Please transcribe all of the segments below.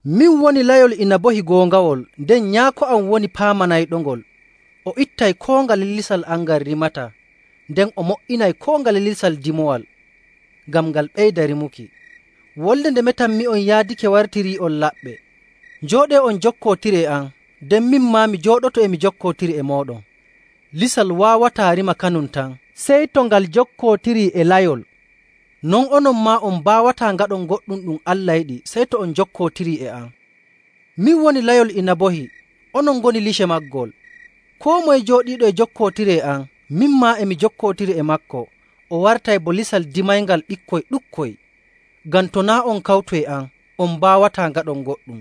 “Min woni layol inabohi goongawol, nden Nyaako am woni paamanayɗongol. O ittay koo ngale lisal am ngal rimataa, nden o mo''inay koo ngale lisal dimoowal, ngam ngal ɓeyda rimuki. Wolde nde metanmi'on yaadake wartirii'on laɓɓe. Njooɗee on njokkootiri e am, nden min maa mi jooɗoto e mi jokkootiri e mooɗon. Lisal waawataa rima kanum tan, sey to ngal jokkootirii e layol. Non onon maa on mbaawataa ngaɗon goɗɗum ɗum Allah yiɗi sey to on njokkootirii e am. “Min woni layol inabohi, onon ngoni lice maagol. Koo moye jooɗiiɗo e jokkootiri e am, min maa e mi jokkootiri e maako, o wartay bo lisal dimayngal ɓikkoy ɗuɗkoy. Ngam to naa' on kawtu e am, on mbaawataa ngaɗon goɗɗum.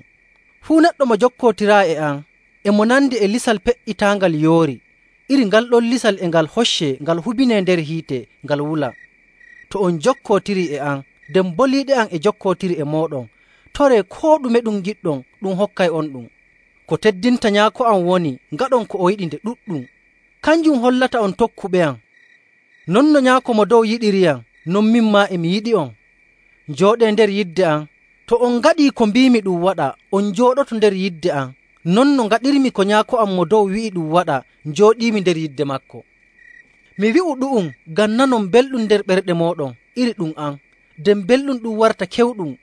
Fuu neɗɗo mo jokkotiraayi e am, e mo nandi e lisal pe''itaangal yoori. Iri ngal ɗon lisal e ngal hoccee ngal hubinee nder hiite ngal wula. To on njokkootirii e am nden boliiɗe am e njokkootiri e mooɗon, toree koo ɗume ɗum ngiɗɗon, ɗum hokkay'onɗum. Ko teddinta Nyaako am woni ngaɗon ko o yiɗi nde ɗuɗɗum. Kanjum hollata on tokkuɓeyam. Non no Nyaako Mo Dow yiɗiriyam, non min maa e mi yiɗi'on. Njooɗee nder yidde am. To on ngaɗii ko mbiimi ɗum waɗa, on njooɗoto nder yidde am, non no ngaɗirmi ko Nyaako am Mo Dow wi'i ɗum waɗa njooɗiimi nder yidde maako. “Mi wi'u'on ɗu'um ngam nanon belɗum nder ɓerɗe mooɗon iri ɗum am, nden belɗum ɗum warta kewɗum.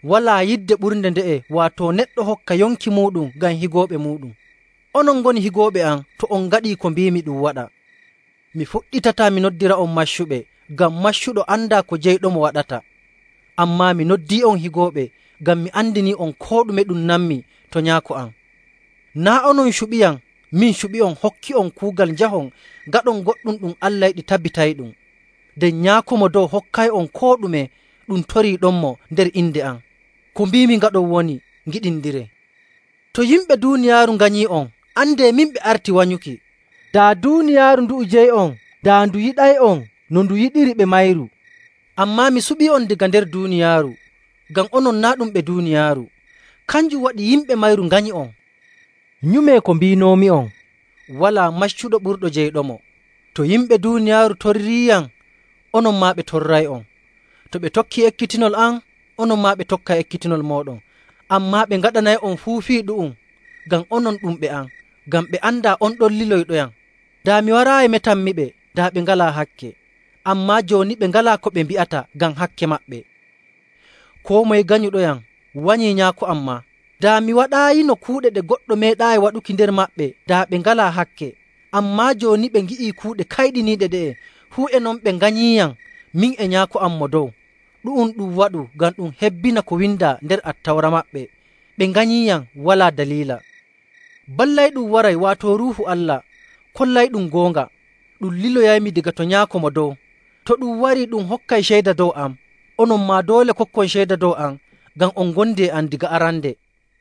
Walaa yidde ɓurnde nde'e, waato neɗɗo hokka yonki muuɗum ngam higooɓe muuɗum. Onon ngoni higooɓe am to on ngaɗii ko mbiimi ɗum waɗa. Mi fuɗɗitataa mi noddira'on maccuɓe, ngam maccuɗo andaa ko jeyɗomo waɗata. Ammaa mi noddii'on higooɓe, ngam mi andinii'on koo ɗume ɗum nanmi to Nyaako am. Naa' onon cuɓiyam, min suɓi'on hokki'on kuugal njahon ngaɗon goɗɗum ɗum Allah yiɗi tabitayɗum. Nden Nyaako Mo Dow hokkay'on koo ɗume ɗum toriiɗonmo nder inde am. Ko mbiimi ngaɗon woni, ngiɗindiree. “To yimɓe duuniyaaru nganyii'on, andee min ɓe arti wanyuki. Daa duuniyaaru ndu'u jeyi'on, daa ndu yiɗay'on no ndu yiɗiri ɓe mayru. Ammaa mi suɓii'on daga nder duuniyaaru, ngam onon naa' ɗum ɓe duuniyaaru. Kanjum waɗi yimɓe mayru nganyi'on. Nyumee ko mbiinoomi'on, ‘Walaa maccuɗo ɓurɗo jeyɗomo.’ To yimɓe duuniyaaru torriiyam, onon maa ɓe torray'on. To ɓe tokkii ekkitinol am, onon maa ɓe tokkay ekkitinol mooɗon.. Ammaa ɓe ngaɗanay'on fuu fii ɗu'um ngam onon ɗum ɓe am, ngam ɓe andaa on ɗon liloyɗoyam. Daa mi waraayi metanmiɓe, daa ɓe ngalaa hakke. Ammaa jooni ɓe ngalaa ko ɓe mbi'ata ngam hakke maɓɓe. Koo moye ganyuɗoyam wanyii Nyaako am maa. Daa mi waɗaayino kuuɗe ɗe goɗɗo meeɗaayi waɗuki nder maɓɓe, daa ɓe ngalaa hakke. Ammaa jooni ɓe ngi'ii kuuɗe kayɗiniiɗe ɗe'e, fuu e non ɓe nganyiiyam min e Nyaako am Mo Dow. Ɗu'um ɗum waɗu ngam ɗum hebbina ko windaa nder Attawra maɓɓe, ‘Ɓe nganyiiyam walaa daliila.’. “Ballayɗum waray, waato Ruuhu Allah kollayɗum goonga, ɗum liloyaymi daga to Nyaako Mo Dow. To ɗum warii, ɗum hokkay ceyda dow am. Onon maa doole kokkon ceyda dow am ngam on ngondi e am daga arande.